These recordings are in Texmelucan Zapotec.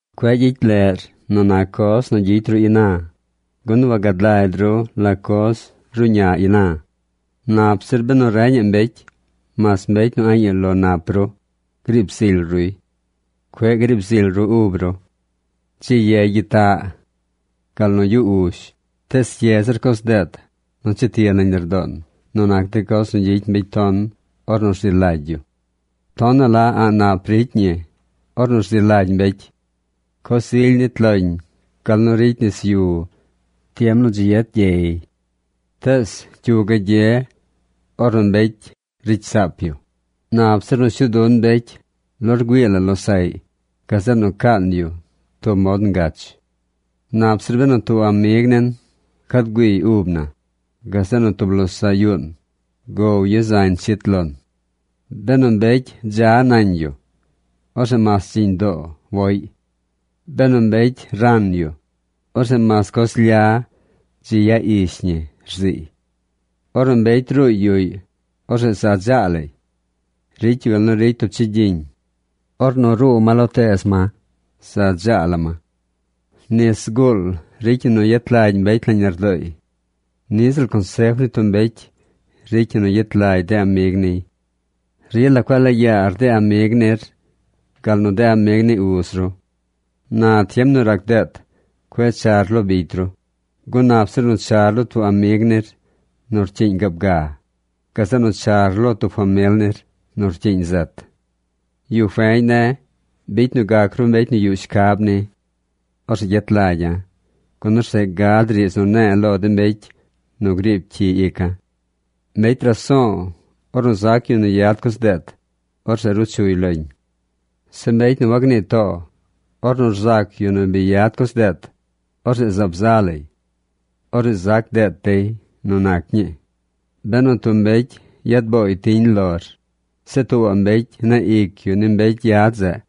Cueꞌ gyicy leꞌr nu nac coz nu gyicy ru ina, gun wagad lagy ru la coz ruꞌña ina. Nap zir benu reñaꞌ mbecy, mas mbecy nu a̱ꞌ yu lo nap ru, griib zily ruy. Cueꞌ griib zily ru ub ru. Dzi ye gyitaꞌ gal nu yu uzh. Tees ye zir coz deet nu cheti nañ lardoon nu nac de coz nu gyicy mbecy ton ornu rzi lagy yu. Tonaꞌ la a̱ꞌ nap ricy ñi ornu rzi lagy mbecy. Coz ily nit loñ gal nu ricy nis yu tiem nu dzi yet gyey. Tees, ¿cyu gagye ornu mbecy ricy saap yu? Nap zir nu shuu dun mbecy lo rgüii la losaꞌy gazeꞌ nu caan yu tub mod ngach. Nap zir benu tub amig nin cad güiiy ub na, gazeꞌ nu tub losaꞌ yuun gow yu zañ chit lon. Benu mbecy dza nañ yu, orzeꞌ mas dziñ doo woꞌy. Benu mbecy ran yu, orzeꞌ mas coz lya dzi ya ish ñi, rziiy. Ornu mbecy ruuy yuꞌy, orzeꞌ za dzaa lay. Ricy yu gal nu ricy tub chigyiñ. Ornu ruu ma lo teez ma, za dzaa la ma. Nis zguul ricy ñi nu yet lagy mbecy nañ lardooy. Niꞌ ziꞌl consef ni tub mbecy ricy ñi nu yet lagy de amig niy. Rila cueꞌ laa yaar de amig nir gal nu de amig ni uz ru. Na tiem nu rac deet cueꞌ char lo bicy ru, gun nap zir nu char lo tub amig nir nu rcyiiñ gaab ga, gazeꞌ nu char lo tub famil nir nu rcyiiñ zet. Yu feñ ne̱, bicy nu gac ru mbecy nu yuꞌ shcab ni. Orzeꞌ gyet lagya̱. Gun orzeꞌ gad riidz nu ne̱e̱ lo de mbecy nu griib cyi ica̱. Mbecy raso̱o̱, ornu zac yu nu yad coz deet, orzeꞌ ruu chuy loñ. Zeꞌ mbecy nu wagnii too, ornu rzac yu nu bi yad coz deet, orzeꞌ zaab za lay. Orzeꞌ zac deet dey nu nac ñii. Benu tub mbecy yad booy tiñ lor, zeꞌ tuubaꞌ mbecy neꞌ ic yu ni mbecy yad zeꞌ,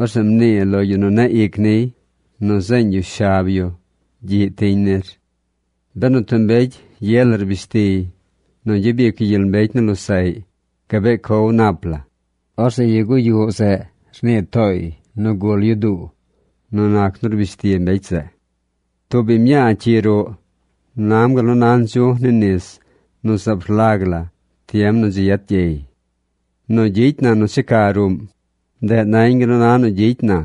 orzeꞌ mnii lo yu nu neꞌ ic niy nu rzeeñ yu shab yu gyiꞌ tiñ nir. Benu tub mbecy ye la rbish tiy nu gyabic yu gyel mbecy ni losaꞌy gabee cow nap la, orzeꞌ yu guyuꞌ zeꞌ rnii tooy nu gul yu duu nu nac nu rbish ti mbecy zeꞌ. Tub biñ mñaa cyi ruꞌ nam gal nu na ndzu̱j ni nis nu zaab rlag la tiem nu dzi yet gyey. Nu gyicy na nu checa ruꞌm, ndeꞌ nañ gal nu na nu gyicy na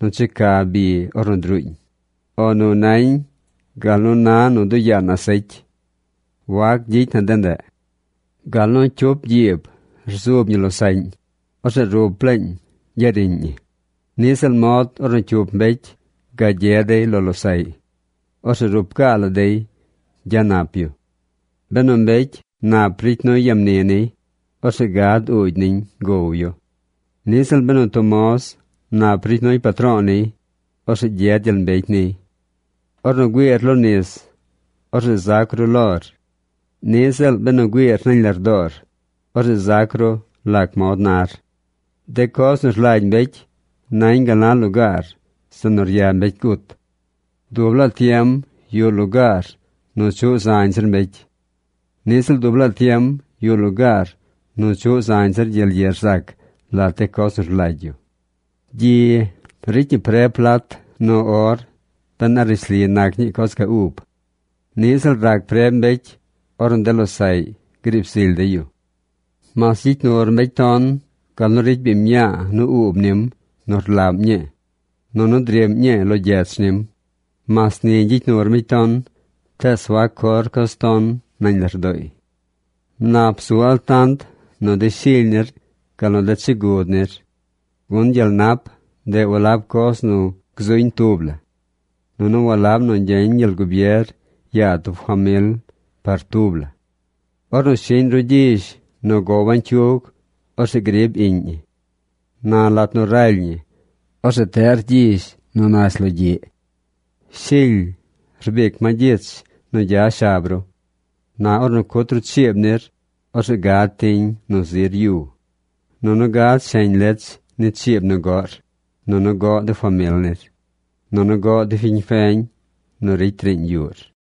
nu checa bi ornu druuñ, o nu nañ gal nu na nu duꞌ yaan asecy. Wac gyicy na de ndeꞌ. Gal nu cyup gyiib rzub ñi losaꞌñ, orzeꞌ rup laañ gya riꞌñ ñi, niꞌ ziꞌl mod ornu cyup mbecy gagye dey lo losaꞌy. Orzeꞌ rup gaa la dey gya nap yu. Benu mbecy nap ricy nuy ya mni niy, orzeꞌ gad uugy niñ gow yu. Niꞌ ziꞌl benu tub moz nap ricy nuy patro̱o̱ niy, orzeꞌ gyed gyel mbecy niy. Ornu güiir lo nis, orzeꞌ zac ru lor. Niꞌ ziꞌl benu güiir nañ lardoor, orzeꞌ zac ru lac mod nar. De coz nu rlagy mbecy nañ gal na lugaar zeꞌ nu rya mbecy gut. Dub laa tiem yuꞌ lugaar nu chuꞌ zañ zir mbecy. Niꞌ ziꞌl dub laa tiem yuꞌ lugaar nu chuꞌ zañ zir gyel ye rzac lat de coz nu rlagy yu. Gyi ricy ñi preb plat nu or ben a rishli nac ñii coz ga ub. Niꞌ ziꞌl rac preb mbecy ornu de losaꞌy griib zily dey yu. Mas gyicy nur mbecy ton gal nu ricy biñ mñaa nu uub nim nu rlaꞌm ñii nunu driꞌm ñii lo gyech nim, mas ni gyicy nur mbecy ton tees wac cor coz ton nañ lardooy. Nap bzu altant nu de shily nir gal nu de chigud nir. Gun gyel nap, ndeꞌ walab coz nu gzuñ tub la. Nunu walab nu gyeñ gyel gubier yaa tub famil par tubla. Ornu shiꞌñ ru gyizh nu gow bañcyug, orzeꞌ grib iꞌñ ñi. Na lat nu raly ñi, orzeꞌ teꞌr gyizh nu nash logyiꞌ. Shily rbic ma gyich nu gya shab ru. Na ornu cut ru chiib nir, orzeꞌ gad tiñ nu zir yu. Nunu gad sheñ lech ni chiib nu goꞌr, nunu goꞌ de famil nir, nunu goꞌ de fiñ feñ nu ricy riiñ yuꞌr.